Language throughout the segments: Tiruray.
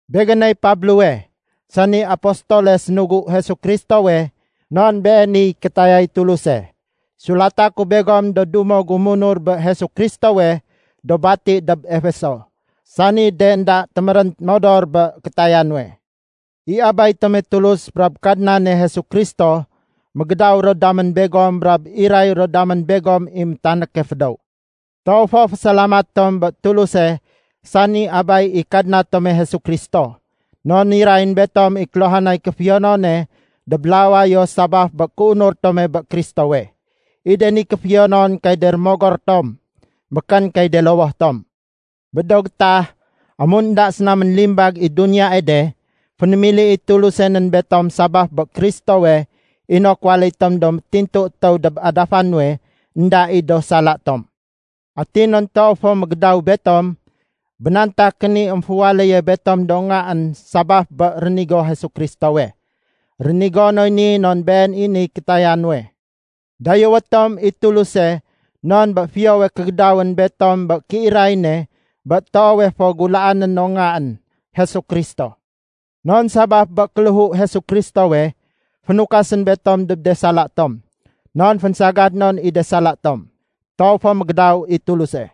Begéney Pablowe, sani apostole sénugu Jesu Kristowe non beeniy kétayay Tuluse. Sulata ku begom do dumo gu munur bé Jesu Kristowe do bati dob Efeso, sani de énda témérén modor bé kétaya nuwe. I Abay tome Tulus brab Kadnane Jesu Kristo, mégédaw ro damén begom brab iray ro damén begom i métanéke fédéw. Toow fo fésalamat tom bé Tuluse sani Abay i Kadna tome Jesu Kristo. Non nirayén betom i kéluhanay kéfiyonone dob lawayo sabaf bé kéunur tome bé Kristowe. I de ni kéfiyonon kay de rémogor tom, békén kay de lowoh tom. Bé do gétah, amun énda séna ménlimbag i duniyae de, fénémili i Tuluse nén betom sabaf bé Kristowe inok waléy tom do métintu étéw dob adafa nuwe énda i do sala tom. Atin non toow fo mégédaw betom, bénantakén i émféwaléye betom do ngaén sabaf bé rénigo Jesu Kristowe. Rénigo noy ni non been i niy kétaya nuwe. Dayéwé tom i Tuluse non bé fiyowe kégédawén betom bé kéiray ne bé toowe fo gulaané no Ngaén, Jesu Kristo. Non sabaf bé kéléhu Kristowe, fénukasén betom dob de sala tom, non fénsagad non i de sala tom. Toow fo mégédaw i Tuluse!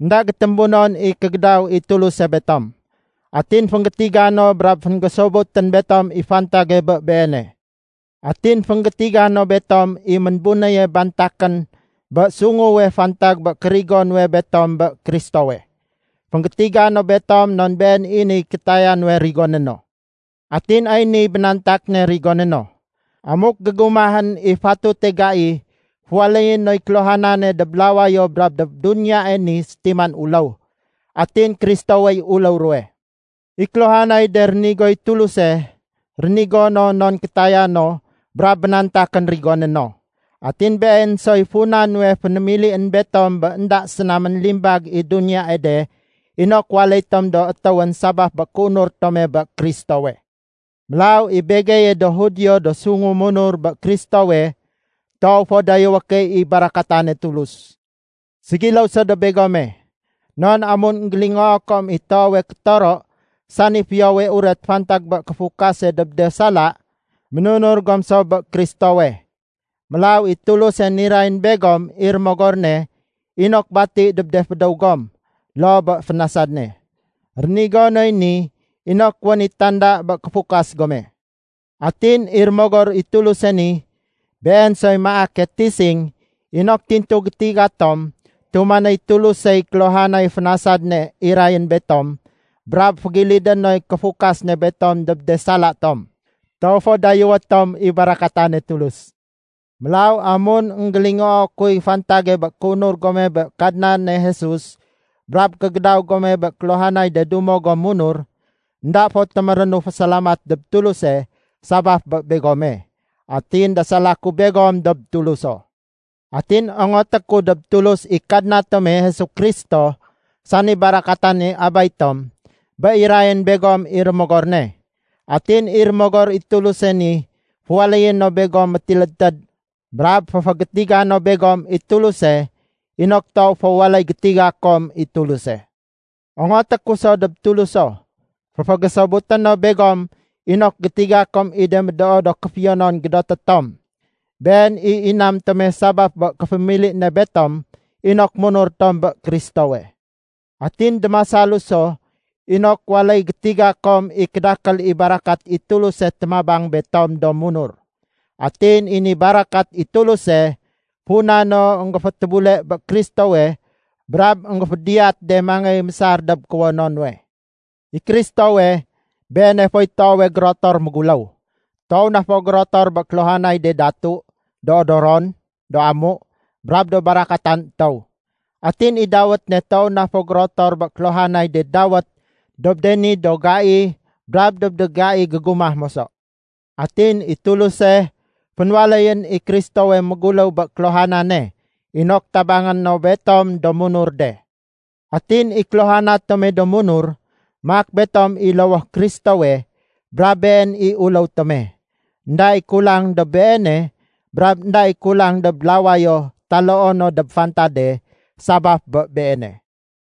Enda gétémbunon i kégédaw i Tuluse betom! Atin fénggétiga no brab fénggésobutén betom i fantage bé Beene. Atin fénggétiga no betom i ménbunéye bantakén bé sunguwe fantag bé kérigo nuwe betom bé Kristowe. Fénggétiga no betom non been i niy kétaya nuwe rigoné no. Atin ay niy bénantak ne rigoné no. Amuk gégumahén i fatute gai, féwaléyé noy kéluhanane dob lawayo brab dob duniyae ni sétiman uléw, atin Kristowey uléw ruwe. I kéluhanay de rénigoy Tuluse, rénigo no non kétaya no brab bénantakén rigoné no. Atin been soy funa nuwe fénémilién betom bé énda séna ménlimbag i duniyae de inok waléy tom do étéwén sabaf bé kéunur tome bé Kristowe. Mélaw i begeye do Judio do sungu munur bé Kristowe, toow fo dayéwé key i barakatane Tulus. Ségiléw so dob begome. Non amun énggélingoo kom i toowe kétoro sani Fiyowe Uret fantag bé kéfukase dob de sala, ménunur gom so bé Kristowe. Mélaw i Tuluse nirayén begom i Rémogor ne inok bati dob de fédéw gom loo bé fénasad ne. Rénigo noy ni inok wén i tanda bé kéfukas gome. Atin i Rémogor i Tuluse ni, Been soy maake tising inok tintu gétiga tom tumanéy Tulusey kéluhanay fénasad ne irayén betom brab fégilidé noy kéfukas ne betom dob de sala tom. Toow fo dayéwé tom i barakatane Tulus! Mélaw amun énggélingoo kuy fantage bé kéunur gome bé Kadnane Jesus brab kégédaw gome bé kéluhanay de dumo gom munur, énda fo témérénu fésalamat dob Tuluse sabaf bé begome. Atin dasala ku begom dob Tuluso. Atin ongoté ku dob Tulus i Kadna tome Jesu Kristo sani barakatane Abay tom, bé irayén begom i Rémogor ne. Atin i Rémogor i Tuluse ni féwaléyé no begom métilédtéd brab féfégétiga no begom i Tuluse inok toow fo waléy gétiga kom i Tuluse. Ongoté ku so dob Tuluso, féfégésobuté no begom inok gétiga kom i de médoo do kéfiyonon gédoté tom. Been i inam tome sabaf bé kéfémili ne betom inok munur tom bé Kristowe. Atin démasalu so inok waléy gétiga kom i kédakél i barakat i Tuluse témabang betom do munur. Atin i ni barakat i Tuluse, funa no énggéfétébule bé Kristowe brab énggéfédiyat de mangéy mésar dob kuwono nuwe. I Kristowe, Beene foy toowe gérotor méguléw. Toow na fo gérotor bé kéluhanay de datu, do odoron, do amu, brab do barakatan étéw. Atin i dawét ne toow na fo gérotor bé kéluhanay de dawét dob de ni do gai brab dob de gai gégumah moso. Atin i Tuluse, fénwaléyén i Kristowe méguléw bé kéluhanane inok tabangé no betom do munur de. Atin i kéluhana tome do munur, maak betom i lowoh Kristowe brab Been i uléw tome. Enda i kulang dob Beene brab énda i kulang dob lawayo taloo no dob fantade sabaf bé Beene.